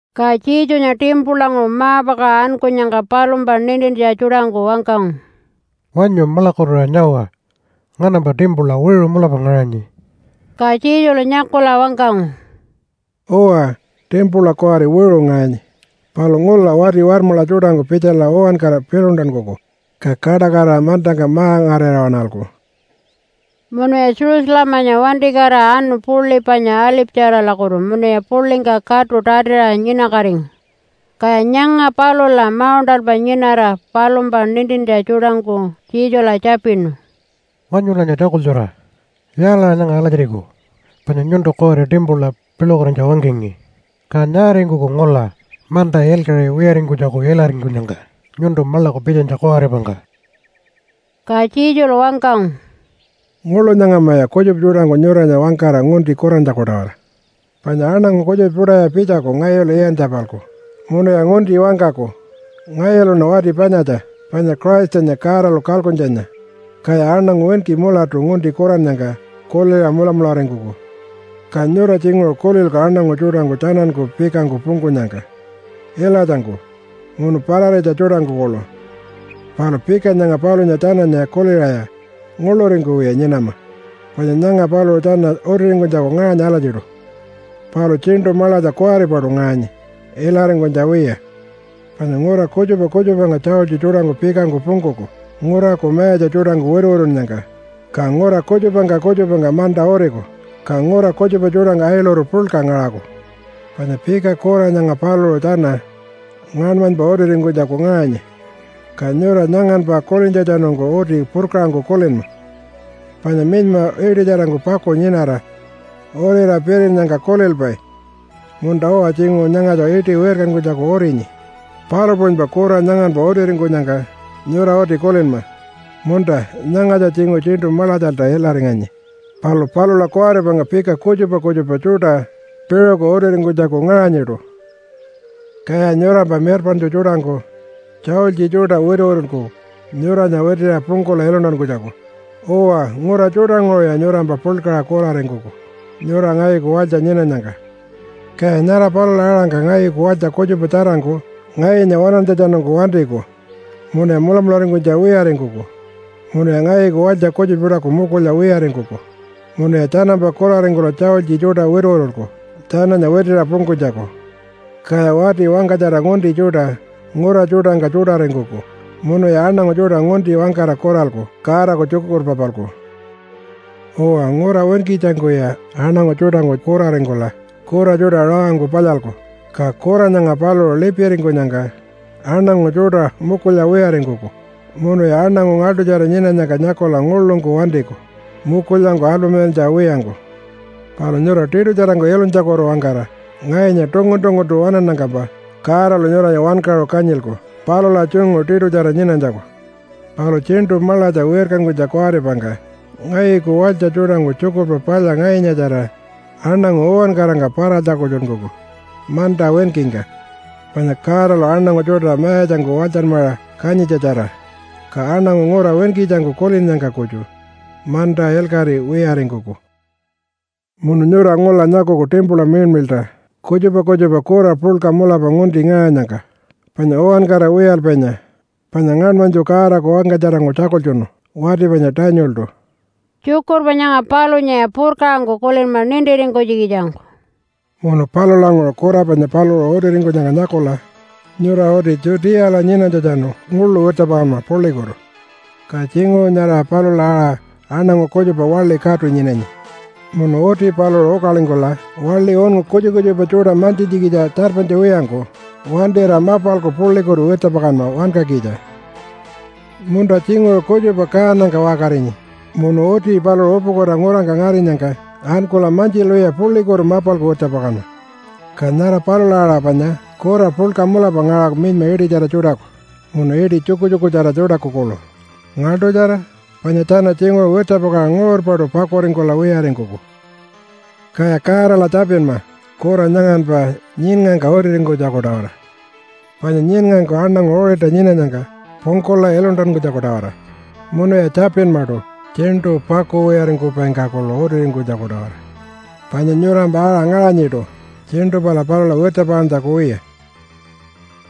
Ka Jesunya timpulanguṟu ma-pakaṟa ankunyangka palumpa nintintja tjuṯangku wangkangu, “Wanyu maḻakukutuṟa nyawa! Nganampa timpula wiṟu mulapa ngaṟanyi.” Ka Jesulu nyakula wangkangu, “Uwa, timpula kuwari wiṟu ngaṟanyi, palu ngula wati warmaḻa tjuṯangku pitjala uwankara piḻuntankuku, ka kaṯakatira mantangka ma-ngarira waṉalku.” Munuya Jerusalemanya wantikatira anu puḻi panya Alipatjaralakutu munuya puḻingka katu tatiṟa nyinakatingu. Kaya nyanga palula mauṉṯalpa nyinara palumpa nintintja tjuṯangku Jesula tjapinu, “Wanyulanya tjakultjura! Yaalaṟa nyanga alatjiriku panya nyuntu kuwari timpula piḻukatinytja wangkangi? Ka nyaaringkuku ngula manta ilkaṟi wiyaringkunytjaku ilaringkunyangka nyuntu maḻaku pitjanytja kuwaripangka?” Ka Jesulu wangkangu, “Nguḻu nyangamaya kutjupa tjuṯangku nyuranya wangkara ngunti kurantjaku-tawara. Panya aṉangu kutjupa tjuṯaya pitjaku ngayulu iyantja-palku munuya ngunti wangkaku, ‘Ngayuluṉa wati panyatja panya Christanya Godalu kalkuntjanya.’ Kaya aṉangu winki mulatu ngunti kurannyangka kuliṟa mulamularingkuku. Ka nyura tjinguṟu kulilku aṉangu tjuṯangku tjananku pikangku pungkunyangka ilatjangku munu pararitja tjuṯangku kuḻu. Palu pika nyanga palunya tjananya kuliṟaya nguḻuringkuwiya nyinama, panya nyanga paluṟu tjana utiringkunytjaku ngaṟanyi alatjiṯu, palu tjiṉṯu maḻatja kuwaripaṯu ngaṟanyi ilaringkunytja wiya. Panya ngura kutjupa kutjupangka tjaultji tjuṯangku pikangku pungkuku nguraku mayatja tjuṯangku wituwitunnyangka. Ka ngura kutjupangka kutjupangka manta uriku, ka ngura kutjupa tjuṯangka ailuru puḻka ngaṟaku. Panya pika kura nyanga paluṟu tjana ngaṉmanypa utiringkunytjaku ngaṟanyi, ka nyura nyanganpa kulintjatjanungku uti purkaṟangku kulinma. Panya minyma iṯitjarangku paku nyinara urira pirinnyangka kulilpai, ‘Munta-uwa tjinguṟu nyangatja iṯi wirkankunytjaku urinyi.’ Palu puṟunypa kura nyanganpa utiringkunyangka nyura uti kulinma, ‘Munta, nyangatja tjinguṟu tjiṉṯu maḻatjalta ilaringanyi, palu palula kuwaripangka pika kutjupa kutjupa tjuṯa piṟuku utiringkunytjaku ngaṟanyiṯu.’ “Kaya nyurampa mirpaṉtju tjuṯangku tjaultji tjuṯa wituwitulku nyuranya witiṟa pungkula iluntankunytjaku. Uwa, ngura tjuṯanguṟuya nyurampa puḻkaṟa kuraringkuku nyura ngayuku walytja nyinanyangka. Kaya nyara palula aṟa ngayuku walytja kutjupa tjarangku ngayunya waṉantjatjanungku wantiku munuya mulamularingkunytja wiyaringkuku. Munuya ngayuku walytja kutjupa tjuṯaku mukulya wiyaringkuku, munuya tjanampa kuraringkula tjaultji tjuṯa wituwitulku tjananya witiṟa pungkunytjaku. Kaya wati wangkatjara ngunti tjuṯa ngura tjuṯangka tjuṯaringkuku munuya aṉangu tjuṯa ngunti wangkara kuralku Godaku tjukurpa-palku. “Uwa, ngura winkitjangkuya aṉangu tjuṯangku kuraringkula kura tjuṯa rawangku palyalku, ka kura nyanga paluṟu lipiringkunyangka aṉangu tjuṯa mukulya wiyaringkuku munuya aṉangu ngaḻṯutjara nyinanyangka nyakula nguḻungku wantiku mukulyangku alpamilantja wiyangku. Palu nyura tiṯutjarangku ilunytjakutu-wangkara ngayunya tungun-tunguntu waṉannyangkampa Godalu nyuranya wankaṟu kanyilku palula tjungu tiṯutjara nyinanytjaku. Palu tjiṉṯu maḻatja wirkankunytja kuwaripangka ngayuku walytja tjuṯangku Tjukurpa Palya ngayunyatjara aṉangu uwankarangka para-tjakultjunkuku manta winkingka, panya Godalu aṉangu tjuṯa mayatjangku walytjanmaṟa kanyintjatjara. Ka aṉangu ngura winkitjangku kulinnyangka kutju manta ilkaṟi wiyaringkuku. “Munu nyura ngula nyakuku timpula miḻmiḻṯa kutjupa kutjupa kura puḻka mulapa ngunti ngaṟanyangka panya uwankara wiyalpainya, panya ngaṉmanytju Godaku wangkatjarangku tjakultjunu wati panya Danieltu.” (Tjukurpa nyanga palunyaya purkaṟangku kulinma nintiringkunytjikitjangku.) “Munu palulanguṟu kura panya paluṟu utiringkunyangka nyakula nyura uti Judeala nyinanytjatjanu nguḻu wirtjapakanma puḻikutu. Ka tjinguṟu nyara palula aṟa aṉangu kutjupa waḻi katu nyinanyi munu uti paluṟu ukalingkula waḻi unngu kutjupa kutjupa tjuṯa mantjintjikitja tjarpanytja wiyangku wantira mapalku puḻikutu wirtjapakanma wankakitja. “Munta tjinguṟu kutjupa kaanangka waṟkarinyi munu uti paluṟu upukuta ngurangka ngarinyangka ankula mantjilwiya puḻikutu mapalku wirtjapakanma. Ka nyara palula aṟa panya kura puḻka mulapa ngaṟaku minyma iṯitjara tjuṯaku munu iṯi tjukutjukutjara tjuṯaku kuḻu. Ngaḻṯutjara! Panya tjana tjinguṟu wirtjapakaṟa nguṟurpaṯu pakuringkula wiyaringkuku. “Kaya Godala tjapinma kura nyanganpa nyiṉngangka utiringkunytjaku-tawara, panya nyiṉngangku aṉangu uṟilta nyinanyangka pungkula iluntankunytjaku-tawara. Munuya tjapinmaṯu tjiṉṯu pakuwiyaringkupaingka kuḻu utiringkunytjaku-tawara, panya nyurampa aṟa ngaṟanyiṯu tjiṉṯu pala palula wirtjapakantjaku wiya.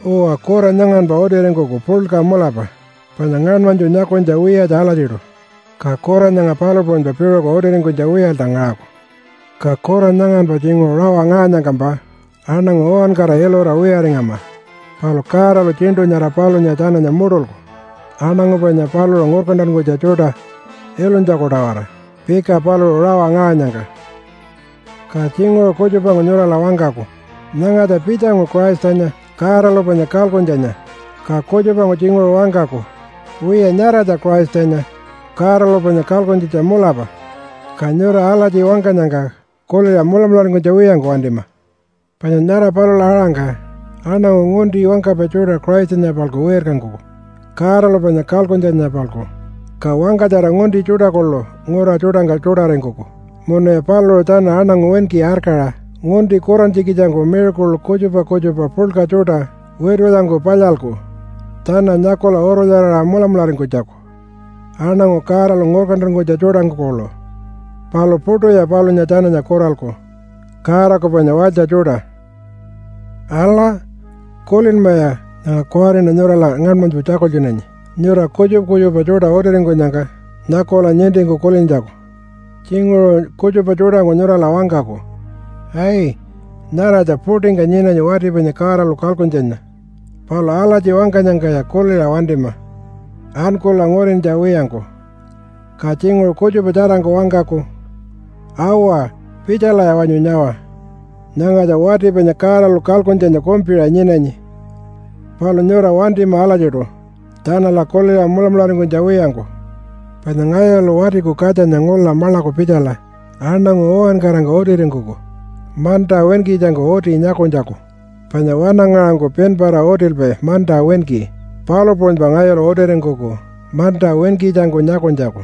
“Uwa, kura nyanganpa utiringkuku puḻka mulapa panya ngaṉmanytju nyakunytja wiyatja alatjiṯu, ka kura nyanga palu puṟunypa piṟuku utiringkunytja wiyalta ngaṟaku. Ka kura nyanganpa tjinguṟu rawa ngaṟanyangkampa aṉangu uwankara ilura wiyaringama. Palu Godalu tjiṉṯu nyara palunya tjananya muṯulku aṉangu panya paluṟu ngurkantankunytja tjuṯa ilunytjaku-tawara pika paluṟu rawa ngaṟanyangka. “Ka tjinguṟu kutjupangku nyurala wangkaku, ‘Nyangatja pitjangu Christanya, Godalu panya kalkuntjanya.’ Ka kutjupangku tjinguṟu wangkaku, ‘Wiya, nyaratja Christanya, Godalu panya kalkuntjitja mulapa.’ Ka nyura alatji wangkanyangka kuliṟa mulamularingkunytja wiyangku wantima. Panya nyara palula aṟangka aṉangu ngunti wangkapai tjuṯa Christanya-palku wirkankuku Godalu panya kalkuntjanya-palku, ka wangkatjara ngunti tjuṯa kuḻu ngura tjuṯangka tjuṯaringkuku, munuya paluṟu tjana aṉangu winki arkaṟa ngunti kurantjikitjangku miracle kutjupa kutjupa puḻka tjuṯa witulyangku palyalku tjana nyakula urulyaraṟa mulamularingkunytjaku, aṉangu Godalu ngurkantankunytja tjuṯangku kuḻu, palu puṯuya palunya tjananya kuralku Godaku panya walytja tjuṯa. “Ala! Kulinmaya nyanga kuwariṉa nyurala ngaṉmanytju tjakultjunanyi nyura kutjupa kutjupa tjuṯa utiringkunyangka nyakula nintingku kulintjaku. Tjinguṟu kutjupa tjuṯangku nyurala wangkaku, ‘Ai! Nyaratja puṯingka nyinanyi wati panya Godalu kalkuntjanya.’ Palu alatji wangkanyangkaya kuliṟa wantima ankula ngurintja wiyangku. Ka tjinguṟu kutjupa tjarangku wangkaku, ‘Awa! Pitjalaya wanyu nyawa! Nyangatja wati panya Godalu kalkuntjanya kumpiṟa nyinanyi.’ Palu nyura wantima alatjiṯu tjanala kuliṟa mulamularingkunytja wiyangku. Panya ngayulu Watiku Katjanya ngula maḻaku pitjala aṉangu uwankarangka utiringkuku manta winkitjangku uti nyakunytjaku, panya wanangaṟangku pinpara utilpai manta winki, palu puṟunypa ngayulu utiringkuku manta winkitjangku nyakunytjaku.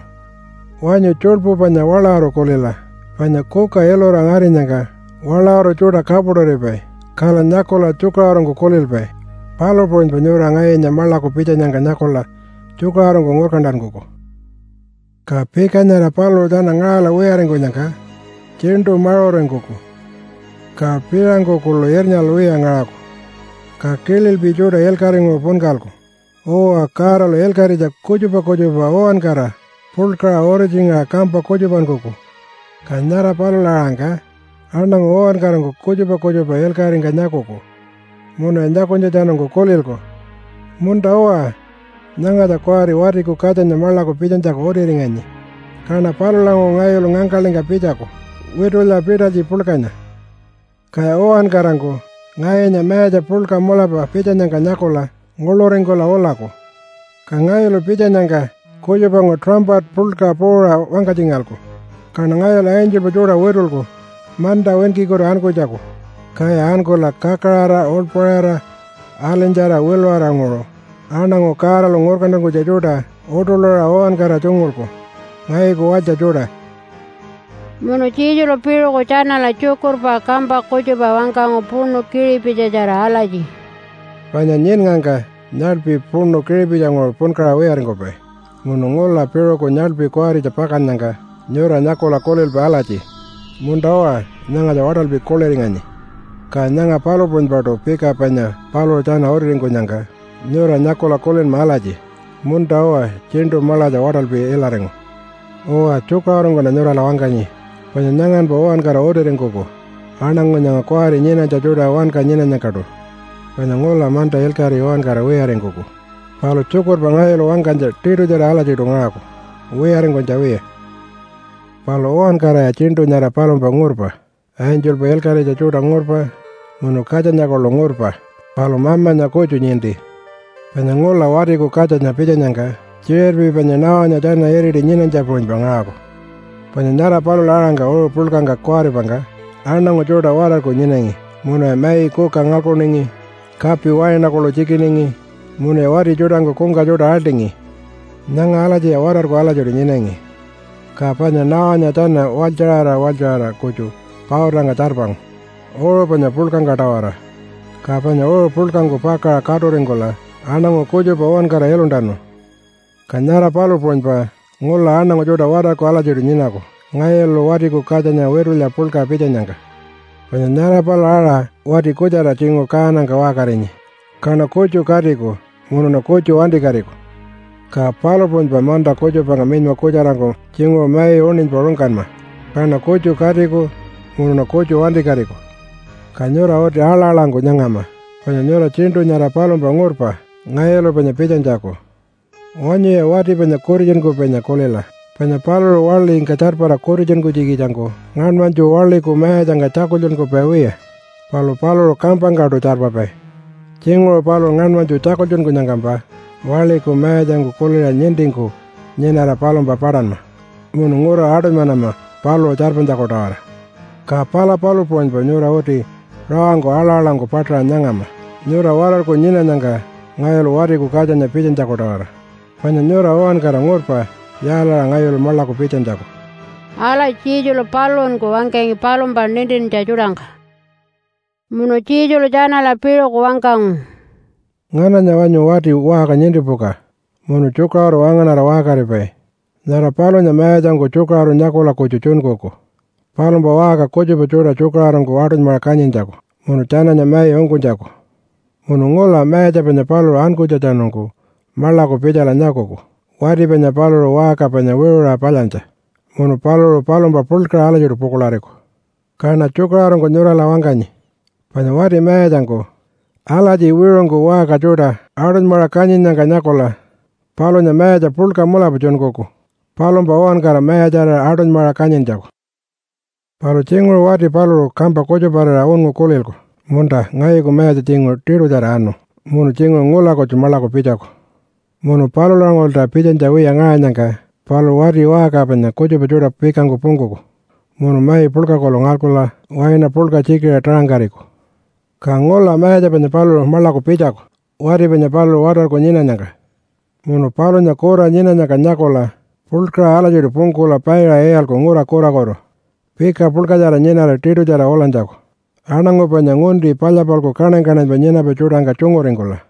Wanyu tjuḻpu panya waḻawuru kulila! Panya kuka ilura ngarinyangka waḻawuru tjuṯa kapuṯuripai. Kala nyakula tjukaṟurungku kulilpai. Palu puṟunypa nyura ngayunya maḻaku pitjanyangka nyakula tjukaṟurungku ngurkantankuku.” “Ka pika nyara paluṟu tjana ngaṟala wiyaringkunyangka tjiṉṯu maṟuringkuku ka piṟangku kuḻu irnyalwiya ngaṟaku. Ka kililpi tjuṯa ilkaṟinguṟu punkalku. Uwa, Godalu ilkaṟitja kutjupa kutjupa uwankara puḻkaṟa uritjingaṟa kampa kutjupankuku. Ka nyara palula-aṟangka aṉangu uwankarangku kutjupa kutjupa ilkaṟingka nyakuku, munuya nyakunytjatjanungku kulilku, ‘Munta-uwa, nyangatja kuwari Watiku Katjanya maḻaku pitjanytjaku utiringanyi.’ Kaṉa palulanguṟu ngayulu ngangkaḻingka pitjaku witulya pitalytji puḻkanya, kaya uwankarangku ngayunya mayatja puḻka mulapa pitjanyangka nyakula nguḻuringkula ulaku. Ka ngayulu pitjanyangka kutjupangku tuṟampata puḻkaṟa puuṟa wangkatjingalku, kaṉa ngayulu angelpa tjuṯa witulku manta winkikutu ankunytjaku, kaya ankula kakaraṟa uḻpaṟira alinytjara wiluṟaranguṟu aṉangu Godalu ngurkantankunytja tjuṯa uṯuḻuṟa uwankara tjungulku, ngayuku walytja tjuṯa.” Munu Jesulu piṟuku tjanala tjukurpa kampa kutjupa wangkangu puṉu kiṟipitjitjara alatji, “Panya nyiṉngangka nyaḻpi puṉu kiṟipitjinguṟu punkaṟa wiyaringkupai munu ngula piṟuku nyaḻpi kuwaritja pakannyangka nyura nyakula kulilpai alatji, ‘Munta-uwa, nyangatja waṯalpi kuḻiringanyi.’ Ka nyanga palu puṟunypaṯu pika panya paluṟu tjana utiringkunyangka nyura nyakula kulinma alatji, ‘Munta-uwa tjiṉṯu maḻatja waṯalpi ilaringu.’ Uwa, tjukaṟurungkuṉa nyurala wangkanyi, panya nyanganpa uwankara utiringkuku aṉangu nyanga kuwari nyinanytja tjuṯa wanka nyinanyangkaṯu. Panya ngula manta ilkaṟi uwankara wiyaringkuku, palu tjukurpa ngayulu wangkanytja tiṯutjara alatjiṯu ngaṟaku wiyaringkunytja wiya. “Palu uwankaraya tjiṉṯu nyara palumpa ngurpa. Angelpa ilkaṟitja tjuṯa ngurpa munu Katjanya kuḻu ngurpa, palu Mamanya kutju ninti. Panya ngula Watiku Katjanya pitjanyangka tjiṟirpi panya Noah-nya tjana iriti nyinanytja puṟunypa ngaṟaku. Panya nyara palula-aṟangka uṟu puḻkangka kuwaripangka aṉangu tjuṯa watarku nyinangi, munuya mai kuka ngalkuningi, kapi waina kuḻu tjikiningi, munuya wati tjuṯangku kungka tjuṯa aḻṯingi. Nyanga alatjiya watarku alatjiṯu nyinangi, ka panya Noah-nya tjana walytjaṟara walytjaṟara kutju pautangka tjarpangu uṟu panya puḻkangka-tawara, ka panya uṟu puḻkangku pakaṟa katuringkula aṉangu kutjupa uwankara iluntanu. Ka nyara palu puṟunypa ngula aṉangu tjuṯa watarku alatjiṯu nyinaku ngayulu Watiku Katjanya witulya puḻka pitjanyangka. Panya nyara palula aṟa wati kutjara tjinguṟu kaanangka waṟkarinyi, kaṉa kutju katiku, munuṉa kutju wantikatiku. Ka palu puṟunypa manta kutjupangka minyma kutjarangku tjinguṟu mai uṉinypa rungkanma, kaṉa kutju katiku munuṉa kutju wantikatiku. Ka nyura uti aḻa-aḻangku nyangama panya nyura tjiṉṯu nyara palumpa ngurpa ngayulu panya pitjanytjaku. Wanyuya wati panya kutitjunkupainya kulila, panya paluṟu waḻingka tjarpara kutitjunkunytjikitjangku ngaṉmanytju waḻiku mayatjangka tjakultjunkupai wiya, palu paluṟu kampangkaṯu tjarpapai. Tjinguṟu paluṟu ngaṉmanytju tjakultjunkunyangkampa waḻiku mayatjangku kuliṟa nintingku nyinara palumpa paṯanma munu ngura aṯunymanama paluṟu tjarpanytjaku-tawara. Ka pala palu puṟunypa nyura uti rawangku aḻa-aḻangku paṯaṟa nyangama nyura watarku nyinanyangka ngayulu Watiku Katjanya pitjanytjaku-tawara. Panya nyura uwankara ngurpa yaalaṟa ngayulu maḻaku pitjanytjaku.” Alatji Jesulu paluṟunku wangkangi palumpa nintintja tjuṯangka. Munu Jesulu tjanala piṟuku wangkangu, “Ngananya wanyu wati waṟka nintipuka munu tjukaṟuru wangaṉara waṟkaripai? Nyara palunya mayatjangku tjukaṟuru nyakula kutju tjunkuku palumpa waṟka kutjupa tjuṯa tjukaṟurungku aṯunymaṟa kanyintjaku munu tjananya mai ungkunytjaku. Munu ngula mayatja panya paluṟu ankunytjatjanungku maḻaku pitjala nyakuku wati panya paluṟu waṟka panya wiṟuṟa palyantja. Munu paluṟu palumpa puḻkaṟa alatjiṯu pukuḻariku. Kaṉa tjukaṟurungku nyurala wangkanyi, panya wati mayatjangku alatji wiṟungku waṟka tjuṯa aṯunymaṟa kanyinnyangka nyakula palunya mayatja puḻka mulapa tjunkuku palumpa uwankara mayatjarira aṯunymaṟa kanyintjaku. “Palu tjinguṟu wati paluṟu kampa kutjuparira unngu kulilku, ‘Munta, ngayuku mayatja tjinguṟu tiṯutjara anu munu tjinguṟu ngula kutju maḻaku pitjaku.’ Munu palulanguṟulta pitjanytja wiya ngaṟanyangka paluṟu wati waṟka panya kutjupa tjuṯa pikangku pungkuku munu mai puḻka kuḻu ngalkula waina puḻka tjikiṟa taṟangkariku. Ka ngula mayatja panya paluṟu maḻaku pitjaku wati panya paluṟu watarku nyinanyangka. Munu palunya kura nyinanyangka nyakula puḻkaṟa alatjiṯu pungkula paiṟa iyalku ngura kurakutu pika puḻkatjara nyinara tiṯutjara ulanytjaku aṉangu panya ngunti palya-palku kaṉany-kaṉanypa nyinapai tjuṯangka tjunguringkula.”